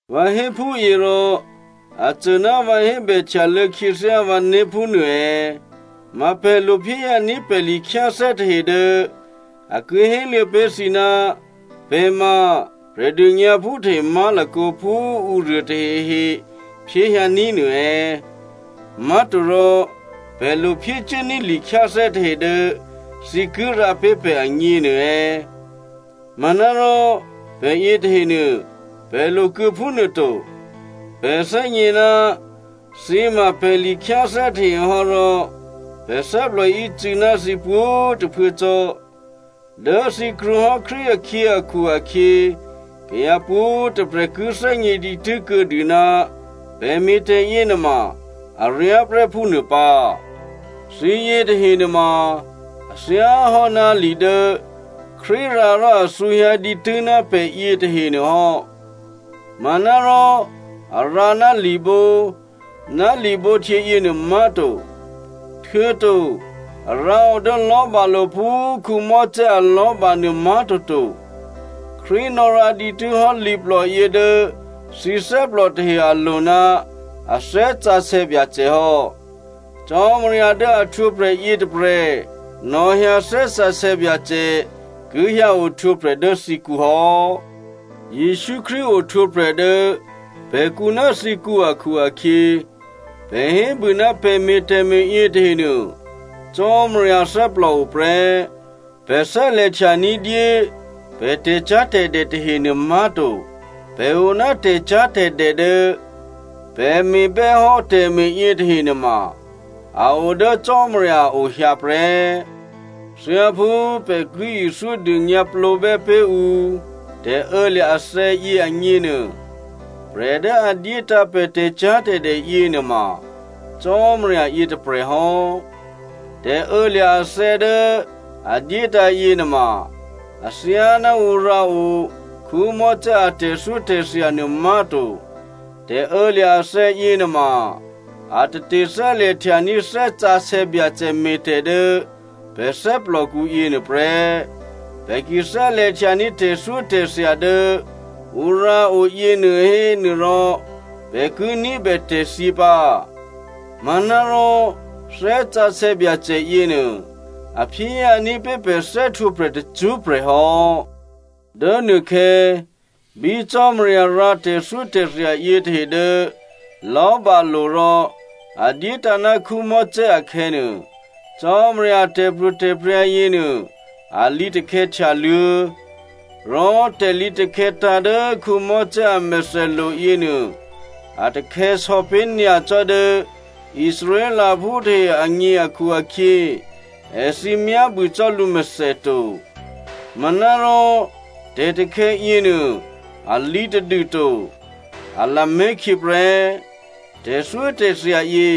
Vǎ hé phúyě rò a cô ná vǎ hébè htyalô̌ khyěthyá vǎné̤ phúnuô è̌? Ma pè̤ lo phyéhyǎní̤ pè̤ likhyáthè́ tahe dố a ki héluô̌ pé̤ thǐ ná pè̤ ma Prè̤dônyǎphú tahe má̤lakǒ phú ǔruô tahehe phyéhyǎní̤ nuô è̌? Má̤torò pè̤ lo phyécuốní̤ likhyáthè́ tahe dố thǐ ki rǎ pé̤ pè̤ agněnuô è̌? Manárò pè̤ yětahenuô, pè̤ lokuô̌ phúnuô to. Pè̤ thè́gně ná thǐ ma pè̤ likhyáthè́ tahe hò́ rò pè̤ thè́plò ícû́ná thǐ pwǒ̤꤮ tôphuố cò́. Dố thǐ krwǒ hò́ Krístu akhyě akhu-akhyě kayǎ pwǒ̤꤮ tôprè̤ ki thè́gně dǐtû́ kuô̌dû ná pè̤ me̤tè̤ yěnuôma aryá prè́ phúnuô pǎ. Thǐ yětahe nuôma, a thyáhò́ná li dố Krístu rǎ rò a thǔhyǎ dǐtû́ ná pè̤ yětahenuô hò́. Manárò a rǎ ná libǒ ná libǒhtyě yěnuô má̤to, htuô̌to a rǎ o dố lò̤́balo̤ phú Mosè alò̤́ba nuô má̤toto. Krístu nò̌rǎ dǐtû́ hò́ liplòyě dố thǐ thè́plò tahe alo̤ ná a Thè́ Sǎsè̌ Byacè hò́. Cò́marya dố a htwǒprè̤ yětôprè̤ nò̌hyǎ Thè́ Sǎsè̌ Byacè ki hyǎ ohtwǒprè̤ dố thǐkǔ hò́. Jesǔ Krístu ohtwǒprè̤ dố pè̤kǔ ná thǐkǔ akhu-akhyě, pè̤ hébû ná pè̤ me̤ tè̤me̤ yětahenuô, Cò́marya thè́plòo prè́. Pè̤ thè́lè̤htya ní̤dyé pè̤ tè̤cyá̤tè̤dè tahenuô má̤to. Pè̤ o ná tè̤cyá̤tè̤dè dố pè̤ me̤bè́hò́ tè̤me̤ yětahe nuôma a o dố Cò́marya a o hyǎ prè́. Thyáphú pè̤ ki ithyó dônyǎplǒbè́ pé̤ ǔ tè̤ô̌lya̤ athè̌yě agněnuô, prè̤ dố a dyétǎ̤ pè̤ tè̤cyá̤tè̤dè yěnuôma Cò́marya yětôprè̤ hò́. Tè̤ô̌lya̤ athè̌ dố a dyétǎ̤ yěnuôma athyáná ǔ rǎ o Mosè a tè̤thyótè̤thya nuô má̤to. Tè̤ô̌lya̤ athè̌ yěnuôma a tate thè́lè̤htyaní̤ Thè́ Sǎsè̌ Byacè me̤tè̤ dố pè̤ thè́plòkǔ yěnuô prè́. Pè̤ ki thè́lè̤htyaní̤ tè̤thyótè̤thya dố ǔ rǎo yěnuô hénuôrò pè̤ ki ní̤bè tè̤thyě pǎ, manárò Thè́ Sǎsè̌ Byacè yěnuô a phyéhyǎní̤ pé̤ pè̤ thè́htwǒprè̤ tacṳ́prè̤ hò́. Dố nuôkhè̌ bí Cò́marya rǎ tè̤thyótè̤thya yětahe dố lò̤́balo̤ rò a dyétǎ̤ ná Mosè akhè̌nuô, Cò́marya a tè̤pro̤tè̤prya̤ yěnuô a lǐtakhè̌ htyaluô̌. Rò tè̤lǐtakhè̌ tǎ̤ dố Mosè amèthèlo̤ yěnuô, a takhè̌sò̌ pé̤ nyacò́ dố Israelphú tahe agně akhu-akhyě èthǐ myábû cò́ lǔmèthè to. Manárò tè̤takhè̌ yěnuô a lǐtadû to, a lamé̤ khyě prè́. Tè̤thyótè̤thya yě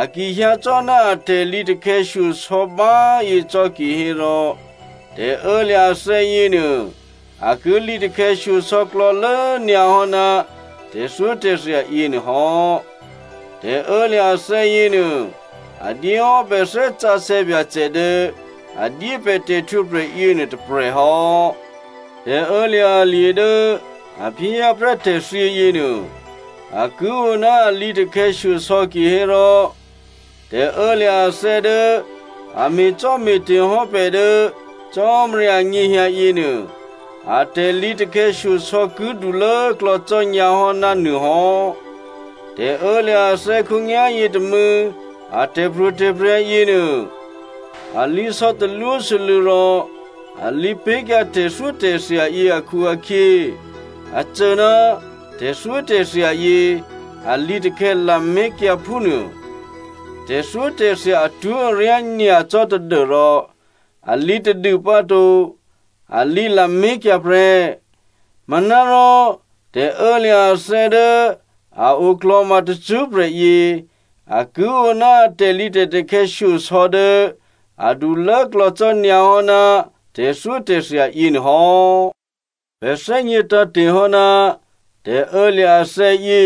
a ki hyǎ cò́ ná a tè̤lǐtakhè̌ shyosò̌ báyě cò́ kihérò tè̤ô̌lya̤ athè̌ yěnuô a ki lǐtakhè̌ shyosò̌klò̌lố nyǎ hò́ ná tè̤thyótè̤thya yěnuô hò́. Tè̤ô̌lya̤ athè̌ yěnuô a dyéhò́ pè̤ Thè́ Sǎsè̌ Byacè dố a dyé pè̤ tè̤htwǒprè̤ yěnuô tôprè̤ hò́. Tè̤ô̌lya̤ alye̤ dố a phyéhyǎ prè́ tè̤thyě yěnuô, a ki o ná alǐatakhè̌ shyosò̌ kihérò, tè̤ô̌lya̤ athè̌ dố a me̤cò́me̤te̤ hò́ pè̤ dố Cò́marya anyěhyǎ yěnuô, a tè̤lǐtè̤takhè̌ shyosò̌ ki dulốklò̌ cò́nyǎ hò́ ná nuô hò́. Tè̤ô̌lya̤ athè̌ khǒnyá̤yě tômû̌ a tè̤pro̤tè̤prya̤ yěnuô alǐsò̌ talwósû́lû̌ rò alǐ pé̤kyǎ tè̤thyótè̤thya yě akhu-akhyě, a cô ná tè̤thyótè̤thya yě a lǐtakhè̌ lamé̤kyǎ phúnuô. Tè̤thyótè̤thya atwó̤aryá nyacò́ tadû́rò a lǐtadû pǎ to, a lǐ lamé̤kyǎ prè́. Manárò tè̤ô̌lya̤ athè̌ dố a oklò̤ma tacṳ́prè̤ yě, a ki o ná a tè̤lǐtè̤takhè̌ shyosò̌ dố adulốklò̌ cò́nyǎ hò́ ná tè̤thyótè̤thya yěnuô hò́. Pè̤ thè́gně tǎ̤te̤ hò́ ná tè̤ô̌lya̤ athè̌yě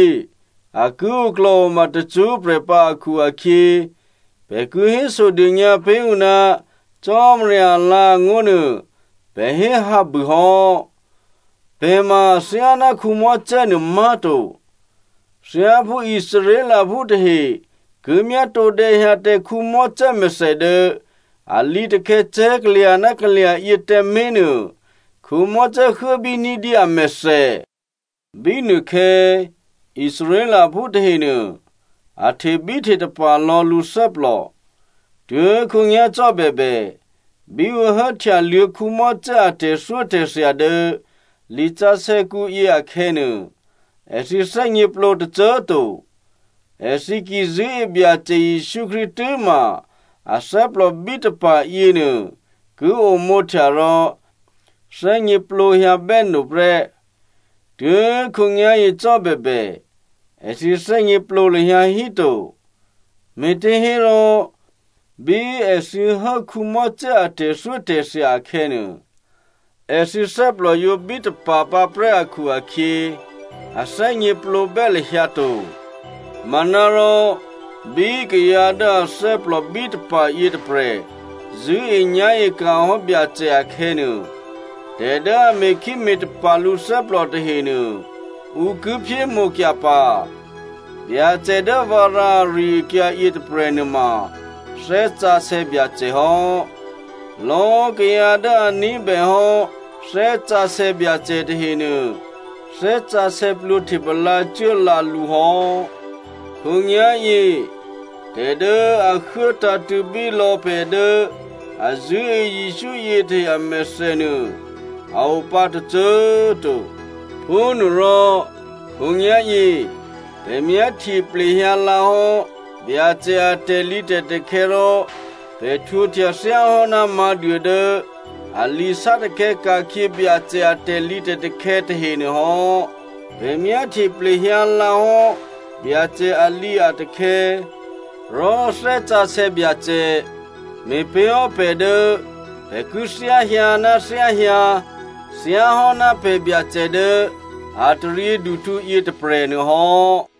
a ki oklò̤oma tacṳ́prè̤ pǎ akhu-akhyě, pè̤ ki hésodônyǎ pé̤ ǔ ná Cò́marya alǎ̤angó̤ nuô pè̤ hé hǎbû hò́. Pè̤ ma athyáná Mosè nuô má̤to. Thyáphú Israelphú tahe ki myátǒdè̌hyǎ tǎ Mosè mèthè dố a lǐtakhè̌ cè̤́kalya̤ ná kalya̤ yě tǎmé̤ nuô, Mosè huốbí ní̤dyé amèthè. Bínuôkhè̌ Israelphú tahenuô, a htebíhtetapa̤ lò̌ lǔ thè́plò. Tuố̤khǒnyá̤ cò́ bèbè, bí ǔ hố htyaluô̌ Mosè a tè̤thyótè̤thya dố lisǎsè̌kǔ yě akhè̌nuô, èthǐ thè́gněplǒ tôcô꤮ to. Èthǐ ki zṳ̂́e Byacè Jesǔ Krístu tû́ma athè́plò bítapa̤ yěnuô ki omǒhtya rò thè́gněplǒhyǎ bè́no prè́. Tuố̤khǒnyá̤yě cò́ bèbè, èthǐ thè́gněplǒ lahyǎ hí to. Me̤těhérò bí èthǐ hố Mosè a tè̤thyótè̤thya akhè̌nuô, èthǐ thè́plò yǒ bítapa̤ pǎprè́ akhu-akhyě, a thè́gněplǒbè́ lahyǎ to. Manárò, bí kayǎ dố athè́plò bítapa̤ yětôprè̤ zṳ̂́enyá̤e ka̤ hò́ Byacè akhè̌nuô, tè̤ dố a me̤khíme̤tapa̤ lǔthè́plò tahenuô ǔ ki phyémǒkyǎ pǎ. Byacè dố vǎ rǎ ari-akyǎ yětôprè̤ nuôma Thè́ Sǎsè̌ Byacè hò́. Lò̌꤮ kayǎ dố a ní̤bèhò́ Thè́ Sǎsè̌ Byacè tahenuô, Thè́ Sǎsè̌ plwǒhtepalǎ cuố lǎ lǔ hò́. Khǒnyá̤yě tè̤ dố a huố tǎ̤tṳ̂̌ bí lò̌꤮ pè̤ dố a zṳ̂́e Jesǔ yětahe amèthè nuô a o pǎ tôcô꤮ to. Phúnuôrò, khǒnyá̤yě pè̤ myáhtye plehyǎ lǎ hò́ Byacè a tè̤lǐtè̤takhè̌ rò pè̤ htwǒhtya thyáhò́ná mǎ̤duô dố a lǐsátakhè̌ ka̤khyě Byacè a tè̤lǐtè̤takhè̌ tahenuô hò́. Pè̤ myáhtye plehyǎ lǎ hò́ Byacè alǐatakhè̌, rò Thè́ Sǎsè̌ Byacè me̤pé̤ hò́ pè̤ dố pè̤ ki thyáhyǎ ná thyáhyǎ, thyáhò́ ná pè̤ Byacè dố a taryěduhtǔ yětôprè̤nuô hò́.